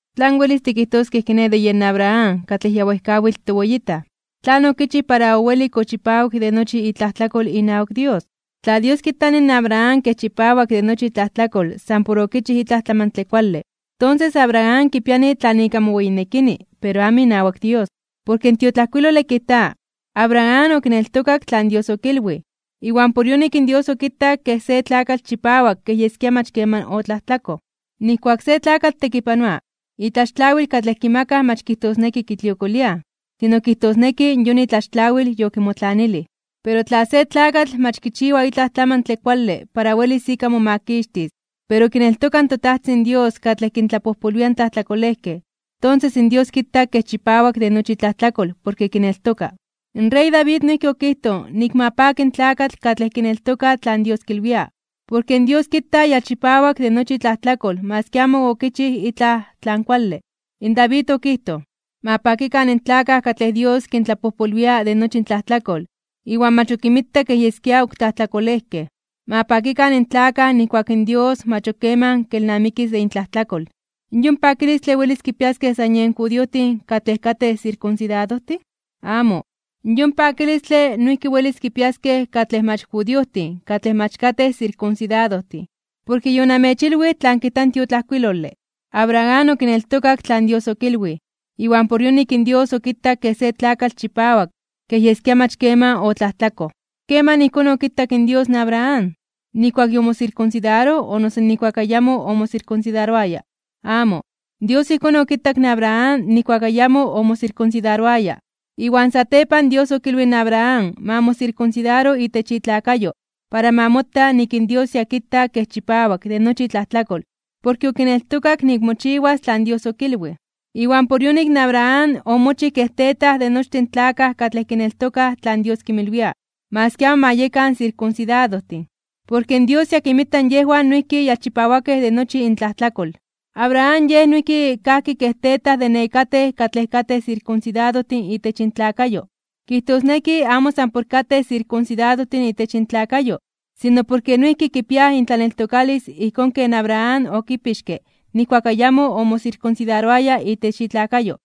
¿Tlan welis tikijtoskej kiné de yen Abraham katlej ya wejkawitl toweyitaj? ¿Tlan okichij para owelik ochipawik de nochi itlajtlakol inawak Dios? Tla Dios kitani in Abraham kej chipawak de nochi itlajtlakol san por okichij itlaj tlamantle kuale, tonses Abraham kipiani tlan ika moweyinekini, pero amo inawak Dios. Porke in tiotlajkuilole kijta: “Abraham okineltokak tlan Dios okilwij, iwan por yonik in Dios okitak kej se tlakatl chipawak kej yeskia mach keman otlajtlakoj.” Nijkuak se tlakatl tekipanoa, itlaxtlawil katlej kimakaj mach kijtosneki kitliokoliaj, sino kijtosneki yon itlaxtlawil yokimotlanilij. Pero tla se tlakatl mach kichiwa itlaj tlamantle kuale para welis ika momakixtis, pero kineltoka in toTajtzin Dios katlej kintlapojpolwia in tlajtlakolejkej, tonses in Dios kita kej chipawak de nochi itlajtlakol porke kineltoka. In rey David noijki okijtoj nik ma paki in tlakatl katlej kineltoka tlan Dios kilwia, porke in Dios kita ya chipawak de nochi itlajtlakol maski amo okichij itlaj tlan kuale. In David okijtoj: Ma pakikan in tlakaj katlej Dios kintlapojpolwia de nochi intlajtlakol iwan mach ok kinmita kej yeskia ok tlajtlakolejkej. Ma pakikan in tlakaj nijkuak in Dios mach ok keman kelnamikis de intlajtlakol. ¿Yon pakilistle welis kipiaskej san yen judiojtin katlej katej sirkunsidadojtin? ¡Amo! Yon pakilistle noijki welis kipiaskej katlej mach judiojtin katlej mach katej sirkunsidadojtin. Porke yonamechilwij tlan kijta in tiotlajkuilole: “Abraham okineltokak tlan Dios okilwij, iwan por yonik in Dios okitak kej se tlakatl chipawak kej yeskia mach keman otlajtlakoj.” ¿Keman ijkón okitak in Dios in Abraham? ¿Nijkuak yomosirkunsidaroj o noso ijkuak ayamo omosirkunsidaroaya? Amo, Dios ijkón okitak in Abraham nijkuak ayamo omosirkunsidaroaya. Iwan satepan Dios okilwij in Abraham ma mosirkunsidaro itech itlakayo para ma mota nik in Dios ya kita kej chipawak de nochi itlajtlakol porke okineltokak nik mochiwas tlan Dios okilwij. Iwan por yonik Abraham omochij kej tetaj de nochtin tlakaj katlej kineltokaj tlan Dios kinmilwia, maski amo ma yekan sirkunsidadojtin, porke Dios ya kinmita yejwan noijki ya chipawakej de nochi intlajtlakol. Abraham yej noijki kajki kej tetaj de nekatej katlej katej sirkunsidadojtin itech intlakayo. Kijtosneki amo san por katej sirkunsidadojtin itech intlakayo, sino porke noijki kipiaj intlaneltokalis ijkón ken Abraham okipixke nijkuak ayamo omosirkunsidaroaya itech itlakayo.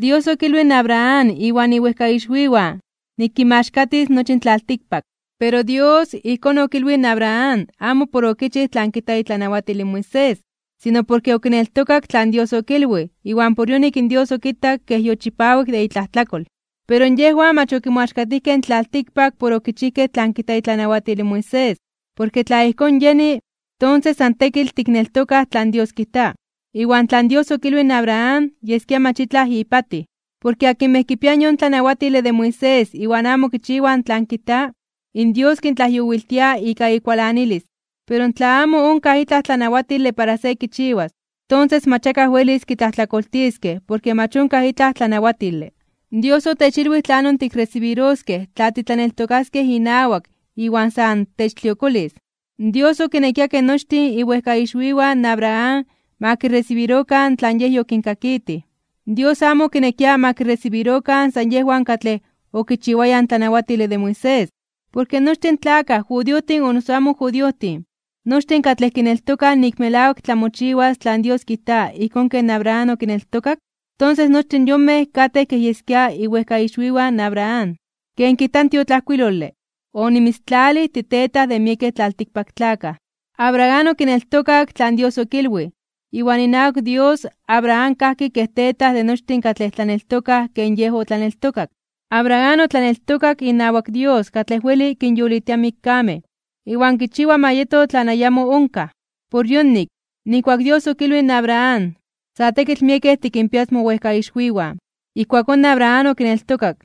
Dios okilwij in Abraham iwan iwejkaixwiwan nik kinmaxkatis nochi in tlaltikpak, pero Dios ijkón okilwij in Abraham amo por okichij tlan kijta itlanawatil in Moisés, sino porke okineltokak tlan Dios okilwij iwan por yonik in Dios okitak kej yochipawik de itlajtlakol. Pero yejwan mach okimoaxkatijkej in tlaltikpak por okichijkej tlan kijta itlanawatil in Moisés. Porke tla ijkón yeni, tonses san tekitl tikneltokaj tlan Dios kijta, iwan tlan Dios okilwij in Abraham yeskia mach itlaj ipatij. Porke akinmej kipiaj yon tlanawatile de Moisés iwan amo kichiwaj tlan kijta, in Dios kintlajyowiltia ika ikualanilis. Pero tla amo onkaj itlaj tlanawatile para se kichiwas, tonses mach akaj welis kitlajtlakoltiskej porke mach onkaj itlaj tlanawatile. Dios otechilwij tlanon tikresibiroskej tla titlaneltokaskej inawak iwan san techtliokolis. Dios okinekia ke nochtin iwejkaixwiwan in Abraham ma kiresibirokan tlan Yej yokinkakitij. Dios amo okinekia ma kiresibirokan san yejwan katlej okichiwayaj in tlanawatile de Moisés. Porke nochtin in tlakaj judiojtin o noso amo judiojtin, nochtin katlej kineltokaj nik melawak tlamochiwas tlan Dios kijta ijkón ken Abraham okineltokak, tonses nochtin yonmej katej kej yeskia iwejkaixwiwan Abraham. Ken kijta in tiotlajkuilole: “Onimitztalij titetaj de miekej tlaltikpaktlakaj.” Abraham okineltokak tlan Dios okilwij. Iwan inawak Dios, Abraham kajki kej tetaj de nochtin katlej tlaneltokaj ken yej otlaneltokak. Abraham otlaneltokak inawak Dios katlej weli kinyolitia in mikkamej, iwan kichiwa ma yeto tlan ayamo onkaj. Por yonik, nijkuak in Dios okilwij in Abraham: “Sa tekitl miekej tikinpias mowejkaixwiwan”, ijkuakón Abraham okineltokak,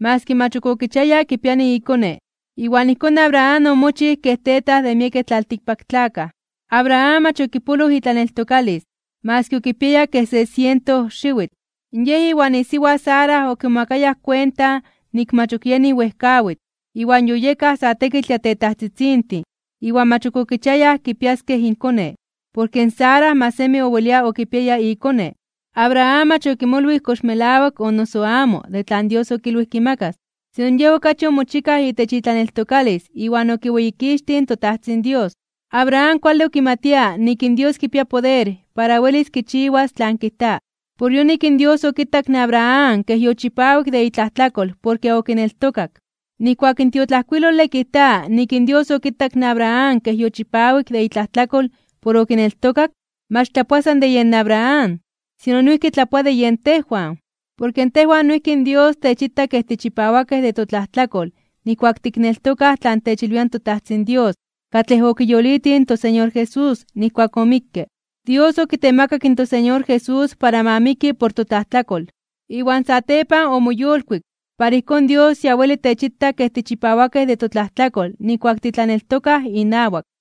maski mach ok okichiaya kipiani ikone. Iwan ijkón Abraham omochij kej tetaj de miekej tlaltikpaktlakaj. Abraham mach okipoloj itlaneltokalis, maski okipiaya kej se siento xiwitl. Yej iwan isiwa Sara okimomakayaj kuenta nik mach ok yenij wejkawitl, iwan yoyekaj sa tekitl ya tetajtzitzintin iwan mach ok okichiayaj kipiaskej inkone, porke in Sara mach semi owelia okipiaya ikone. Abraham mach okimolwij kox melawak o noso amo de tlan Dios okilwij kimakas, sino yej okachi omochikaj itech itlaneltokalis iwan okiweyikixtij in toTajtzin Dios. Abraham kuale okimatia nik in Dios kipia poder para welis kichiwas tlan kijta. Por yonik in Dios okitak in Abraham kej yochipawik de itlajtlakol porke okineltokak. Nijkuak in tiotlajkuilole kijta nik in Dios okitak in Abraham kej yochipawik de itlajtlakol por okineltokak, mach tlapoa san de yen Abraham, sino noijki tlapoa de yen tejwan. Porke tejwan noijki in Dios techita kej tichipawakej de totlajtlakol nijkuak tikneltokaj tlan techilwia in toTajtzin Dios katlej okiyolitij in toSeñor Jesús nijkuak omikke. Dios okitemakak in toSeñor Jesús para ma miki por totlajtlakol. Iwan satepan omoyolkuik, para ijkón Dios ya weli techita kej tichipawakej de totlajtlakol nijkuak titlaneltokaj inawak.